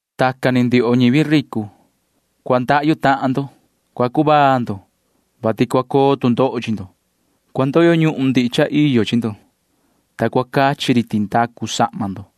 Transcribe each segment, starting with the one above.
Tacan ni ndioho ñivi ricu―cua ndahyu tahan ndo. Cua cuvaa ndo, vati cua coo tu ndoho chi ndo. Cua ndoyo ñuhun ndihi cha iyo chi ndo, ta cua cachi ri tindacu sahma ndo.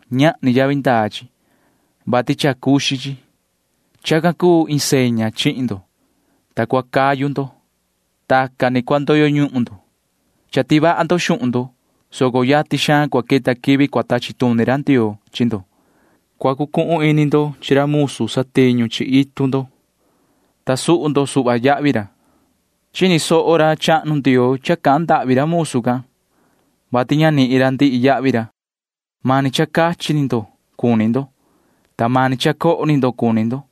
Ñahni ca yavi ndaa xuhun ndo, vati cha cuxin chi. Tacan ni cua coto ndo ti ña vaha ndo, ta cua cayu ndo. Tacan ni cua ndoyo ñuhun ndo. Cha tivaha ndo xuhun ndo, soco yatin xaan cua queta quivi cua tachi tuni ra Ndioo chi ndo. Cua cucuhun ini ndo chi ra musu satiñu chi itu ndo, ta suhu ndo suhva yahvi ra. Chini soho ra chahnu Ndioo cha cahan ndahvi ra musu can, vati ña nihin ra ndihi yahvi ra. Mani cha cua cachi ndo cuni ndo, ta mani cha cua coho ndo cuni ndo.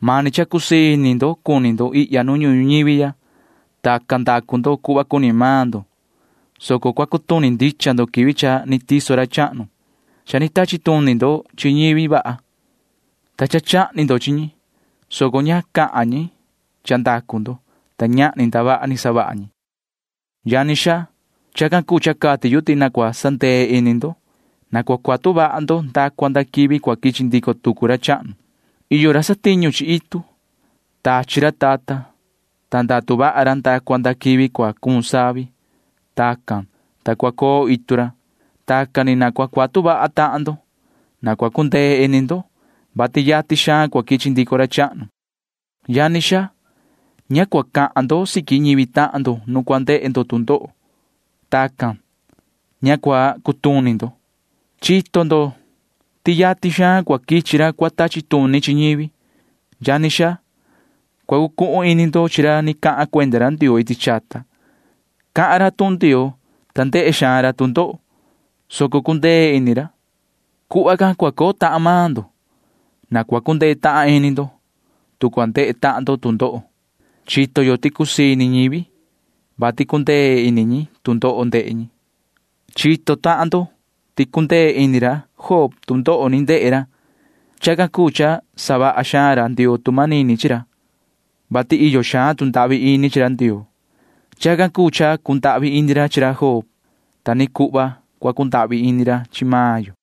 Mani cha cua cusii ini ndo cuni ndo ihya nu ñuhun ñuñivi ya. Tacan ni ndacu ndo cuhva cuni maan ndo, soco cua cutuni ndicha ndo quivi cha ni tiso ra chahnu. Cha ni tachi tuni ndo chi ñivi vaha, ta cha chahni ndo chi ñi, soco ña cahan ndico ñi vaha can chi ndo, ta ñahni ndavaha ni savaha ñi. Yani xaa, chacan cuu cha cati yu ti na cua sandee ini ndo. Na cua cuatu vaha ndo nda cua nda quivi cua quichi ndico tucu ra chahnu. Iyo ra satiñu chi itu. Tachi ra tata, ta ndatu vaha ra nda cua nda quivi cua cuun savi. Tacan cuu, ta cua coo itu ra. Tacan ni na cua cuatu vaha ndo. Na cua cundee ini ndo, vati yatin xaan cua quichi ndico ra chahnu. Yani xaa, ña cua cahan ndo siqui ñivi tahan ndo nu cua ndehe ndo tu ndoho. Tacan, ta ña cua cutuni ndo. Chito ndo ti yatin xaan cua quichi ra cua tachi tuni chi ñivi. Yani xaa, cua cucuhun ini ndo chi ra ni cahan cuenda ra Ndioo iti chata. Cahan ra tuhun Ndioo, ta ndehe xaan ra tu ndoho, soco cundee ini ra. Cuhva can cua coo tahan maan ndo. Na cua cundee tahan ini maan ndo, tu cua ndehe tahan ndo tu ndoho. Chito yo ti cusii ini ñivi, vati cundee ini ñi tu ndoho ndehe ñi. Chito tahan ndo ti cundee ini ra Job nu ni ndehe ra tu ndoho. Chacan cuu cha savaha xaan ra Ndioo tu manini chi ra, vati iyo xaan tu ndahvi ini chi ra Ndioo. Chacan cuu cha cundahvi ini ra chi ra Job can. Ta ni cuhva cua cundahvi ini ra chi maan yo.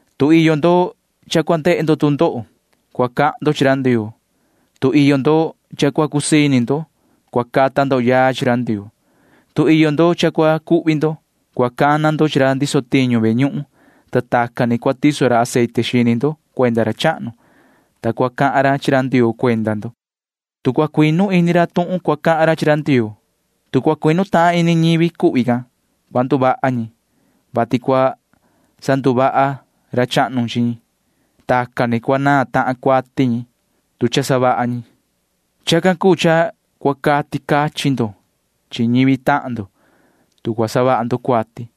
Tu iyo ndo cha cua ndehe ndo tu ndoho, cua cahan ndo chi ra Ndioo. Tu iyo ndo cha cua cusii ini ndo, cua cata ndo yaa chi ra Ndioo. Tu iyo ndo cha cua cuhvi ndo, cua cana ndo chi ra ndiso tiñu ve ñuhun, ta tacan ni cua tiso ra aceite xini ndo cuenda ra chahnu, ta cua cahan ra chi ra Ndioo cuenda ndo. Tu cua cuinu ini ra tuhun cua cahan ra chi ra Ndioo, tu cua cuinu tahan ini ñivi cuhvi can, cua nduvaha ñi, vati cua sanduvaha ra chahnu chi ñi. Tacan ni cua naan tahan cuati ñi, tu cha savaha ñi cuati. Chacan cuu cha cua cati cachin ndo chi ñivi tahan ndo, tu cua savaha ndo cuati.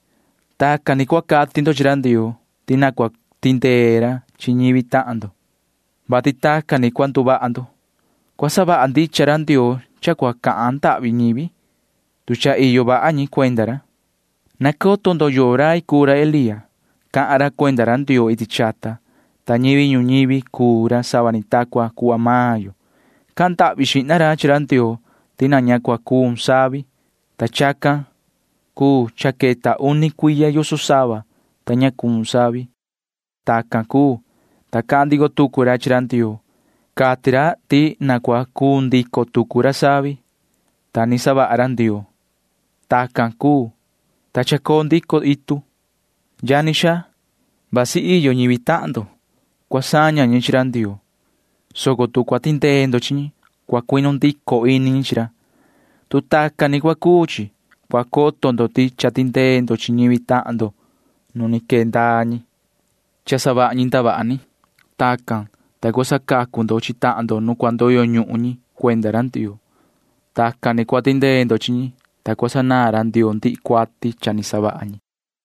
Tacan ni cua cati ndo chi ra Ndioo ti na cua tindee ra chi ñivi tahan ndo, vati tacan ni cua nduvaha ndo. Cua savaha ndicha ra Ndioo cha cua cahan ndahvi ñivi, tu cha iyo vaha ñi cuenda ra. Nacoto ndo yoo rai cuu ra Elía. Cahan ra cuenda ra Ndioo iti chata, ta ñivi ñuñivi cuu ra sava ni ta cuhva maan yo. Cahan ndahvi xihna ra chi ra Ndioo ti na ña cua cuun ca savi, ta chacan cuu cha queta uni cuiya yoso sava, ta ña cuun ra. Tacan cuu, ta cahan ndico tucu ra chi ra Ndioo. Cati ra ti na cua cuun ndico tucu ra savi, ta ni chaha ra Ndioo. Tacan cuu, ta cha chacoo ndico itu. Yani xaa, vasi iyo ñivi tahan ndo cua saña ñi chi ra Ndioo, soco tu cua tindee ndo chi ñi, vasi cua cuinu ndico ini ñi chi ra. Tu tacan ni cua cuu chi, cua coto ndo ti cha tindee ndo chi ñivi tahan ndo nu quee ndaa ñi, ta savaha ñi ndavaha ni. Tacan, ta cua sacacu ndo chi tahan ndo nu cua ndoyo ñuhun ñi cuenda ra Ndioo. Tacan ni cua tindee ndo chi ñi, ta cua sanaan ra Ndioo ndihi cuati cha ni savaha ñi.